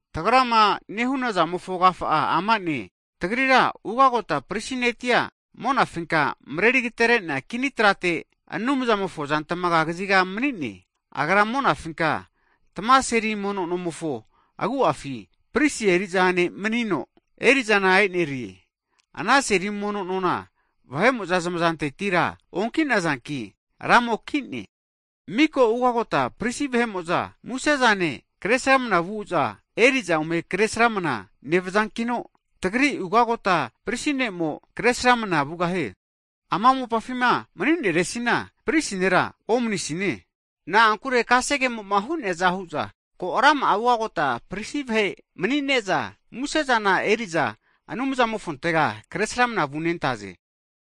Tagrama nehunazamofo agafa'a ama'ne, tagrira Ugagota Prisi ne'tia monafinka mreri agaterenea kini trate Anumzamofo azantamaga kaziga mani'ne. Agra monafinka tamame seri mono nomofo agu'afi Prisi eri'za eri ne' manino, eri'zana e'nerie. Ana seri mono nona vahe'mo'za zamazantetira onki'nazanki, Ramo ki'ne. Miko ugota prisi vahe'mo'za musezane, kresramana vu'za eri'za ome kre sramana nevazankino, tagri Ugagota Prisi Ne'mo kresramana vugahie. Ama mopafima mani'neresina prisi nera omnisine, na'ankure kasegemoma hu'neaza hu'za ko rama'a ugagota prisi vahe mani'ne'za musezana eri'za Anumzamofontega kresramana vunentaze.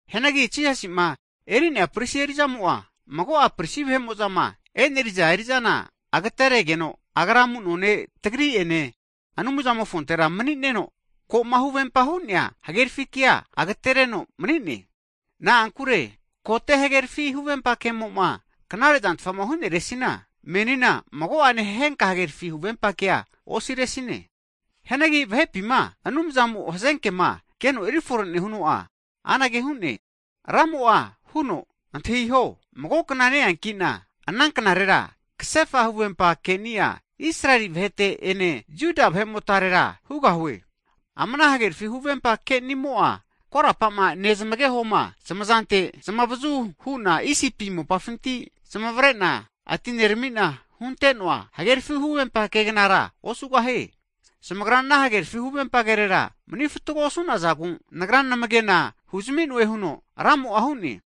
Hianagi Jisasima eri'nea prisi eri'zamo'a mago'a prisi vahe'mo'zama e'neriza eri'zana agaterenegeno, Agra amuno ne' tagri'ene Anumzamofontera manino, koma huvempama hu'nea hagerafi, kea agatereno mani'ne. Na'ankure kote hagerafi huvempa ke'mo'ma knare'zantfa huneresina, menina mago'ane henka hagerafi huvempa kea osiresine. Hianagi vahepima Anumzamo hazenkema keno erifore nehuno'a, anage hu'ne, Ramo'a huno Antahiho mago kna ne'eankina, ana knarera kasefa huvempa keni'a Israeli vahete ene Jiu vahe'motarera hugahue. Ama ana hagerafi huvempa kenimo'a korapama nezamagehoma zamazante zamavazuhuna Isipi mopafinti zmavrena atineramina hunte'noa hagerafi huvempa kegnara osugahie. Zamagra ana hagerafi huvempa kerera mani fatgo osu'nazagu, Nagra namage'na huzami'noe huno Ramo'a hu'ne.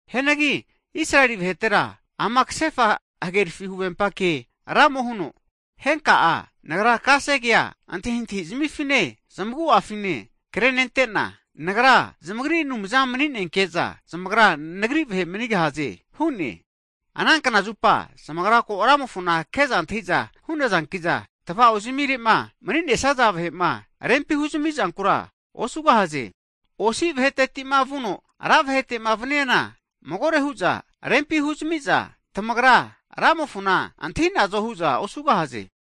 Hianagi Israeli vahetera ama kasefa hagerafi huvempa ke Ramo huno, henka'a Nagra kasegea antahintahi zmifine zamagu'afine krenentena, Nagra zamagri Anumza maninenke'za zamagra nagri vahe manigahaze hu'ne. Ana knazupa zamagra ko Ramofona ke'za antahiza hu'nazankiza, tava'o zamire'ma mani'nesaza vahema rempi huzami zankura osugahaze. Osi vahetetima vuno ra vahetema vaniana, magore hu'za rempi huzamiza tamagra Ramofona antahinazo hu'za osugahaze.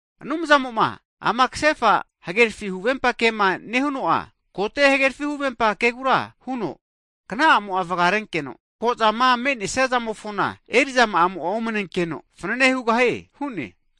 Anumzamo'ma ama kasefa hagerafi huvempa kema nehuno'a kote hagerafi huvempa kegura huno, kna'amo'a vgarenkeno, ko'zama me'nesia zamofona eri'zama'a omanenkeno fanane hugahie hu'ne.